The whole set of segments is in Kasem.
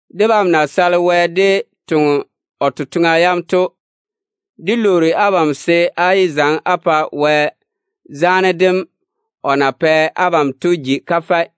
Debam na sale Wɛ dé toŋe o totoŋa yam to, dé lwoori abam se á yé zaŋe á pa Wɛ zaane dem o na pɛ abam to ji kafɛ.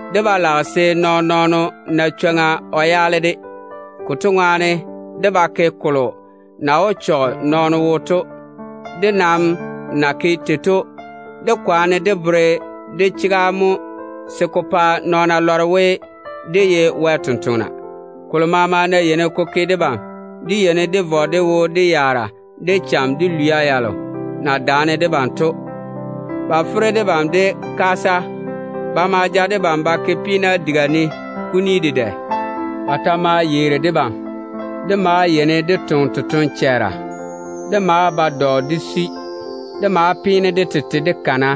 Dé ba lage se nɔɔn-nɔɔno na chwoŋa o yaale dé totoŋa yam. Konto ŋwaane dé ba ke kolo na wó chɔge nɔɔno yiga to. Dé nam na ke tei to, dé kwaane dé bere dé chega mo se ko pa nɔɔna lɔre we, dé ye Wɛ tontoŋena. Kolo maama ná yeini ko ke debam, dé yeini dé vɔ dé wo dedaane yaara, de cham, de lwia yalo na daane debam to. Ba fere debam de kaasa. Ba ma ja debam ba ke peena diga ne kuni dedɛ. Ba ta maa yeeri debam. Dé maa yeini dé toŋe totoŋ-chɛɛra. Dé maa ba dɔ dé sui. Kana maa tiini ka ni debam.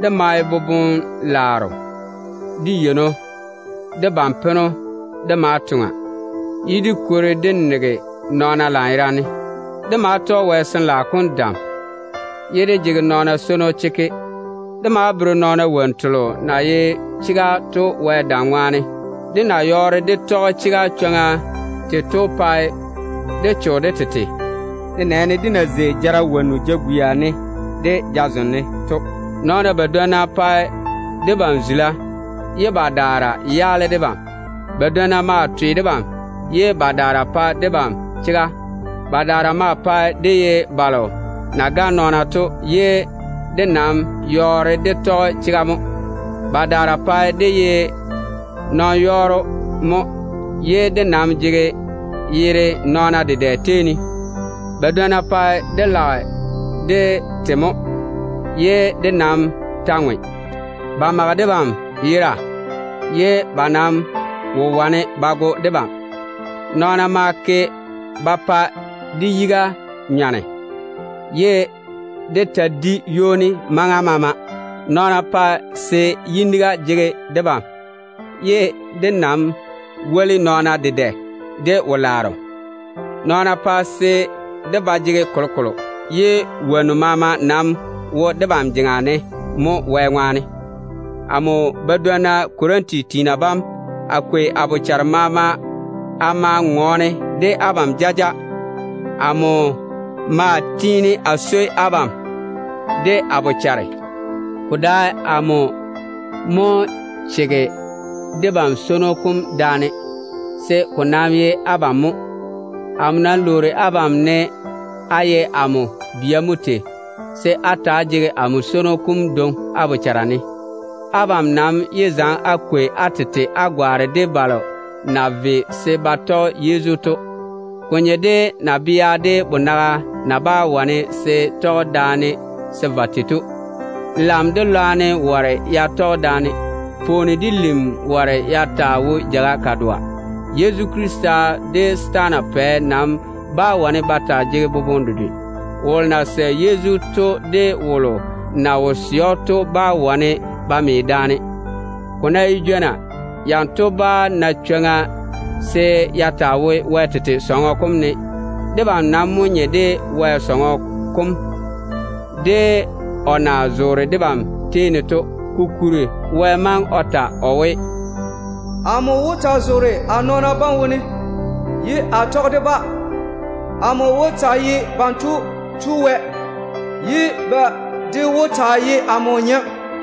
Dé mae boboŋ-laaro, de yeino, de ban-peno dé maa toŋa, ye dé kwori dé nege nɔɔna lanyerane. Dé maa tɔge Wɛ Sin-laao kom dam baŋa dé toŋa, ye dé jege nɔɔna swono chekke. Dé maa bere nɔɔna wonnu telo na ye chega to Wɛ dam ŋwaane. Dé na yɔɔre dé tɔge chega chwoŋa tei to pae dé cho de tete, nenɛɛne dé na zei jara wonnu jagwia ne de jazem ne to. Nɔɔna badwonna pae debam zula, ye badaara yaale debam. Badwonna maa twe debam, ye badaara pae debam chega. Badaara maa pae dé ye balo na gane nɔɔna to, ye dé nam yɔɔre dé tɔge chega mo. Badaara pae dé ye nɔn-yɔɔro mo, ye dé nam jege yere nɔɔna dedɛ tei ne. Badwonna pae dé lage dé te mo, ye dé nam ta ŋwe. Ba mage debam yera, ye ba nam wo wane ba go debam. Nɔɔna maa ke ba pa dé yiga nyɔne, ye dé ta di ywoni maŋa maama. Nɔɔna pae se yiniga jege debam, ye dé nam woli nɔɔna dedɛ de wo-laaro. Nɔɔna pae se dé ba jege kolokolo, ye wonnu maama nam wo debam jeŋa ne mo Wɛ ŋwaane. Amo badwonna Korinti tiina bam, a kwei a bochare maama a ma ŋɔɔne de abam jaja. Amo maa tiini a swoi abam de a bochare. Ko dae amo mo chege debam swono kom daane, se ko nam ye abam mo. Amo nam lwoori abam, ne á ye amo bia mo tei, se á ta‑á jege amo swono kom dwoŋi á bochara ne. Abam nam yé zaŋe á kwei á tete á gwaane de balo na ve se ba tɔge Yezu to. Ko nye de nabea de bonaga na bá wane se tɔge daane se va tei to. Lam de lwarem ware ya tɔge daane. Pwooni de lim ware ya taa wo jeiga dedoa. Yezu Krista de setaana pɛ nam bá wane ba taa jege boboŋe dedwe. Wolo na sɛ Yezu to de wolo na wo sɛ‑o to bá wane ba me daane. Ko ná ye jwona, yanto bá na chwoŋa se ya taa wo Wɛ diga kam ne. Debam nam mo nye de Wɛ tete diga kam, de o na zoore debam tei ne to. Kokuri, Baŋa Wɛ déem tage o we: “Amo wó taa zoore a nɔɔna bam tei ne, ye a tɔge de-ba a via. A maa wó taa ye ba Tu Wɛ wom, ye ba de wó taa ye amo tete nɔɔna.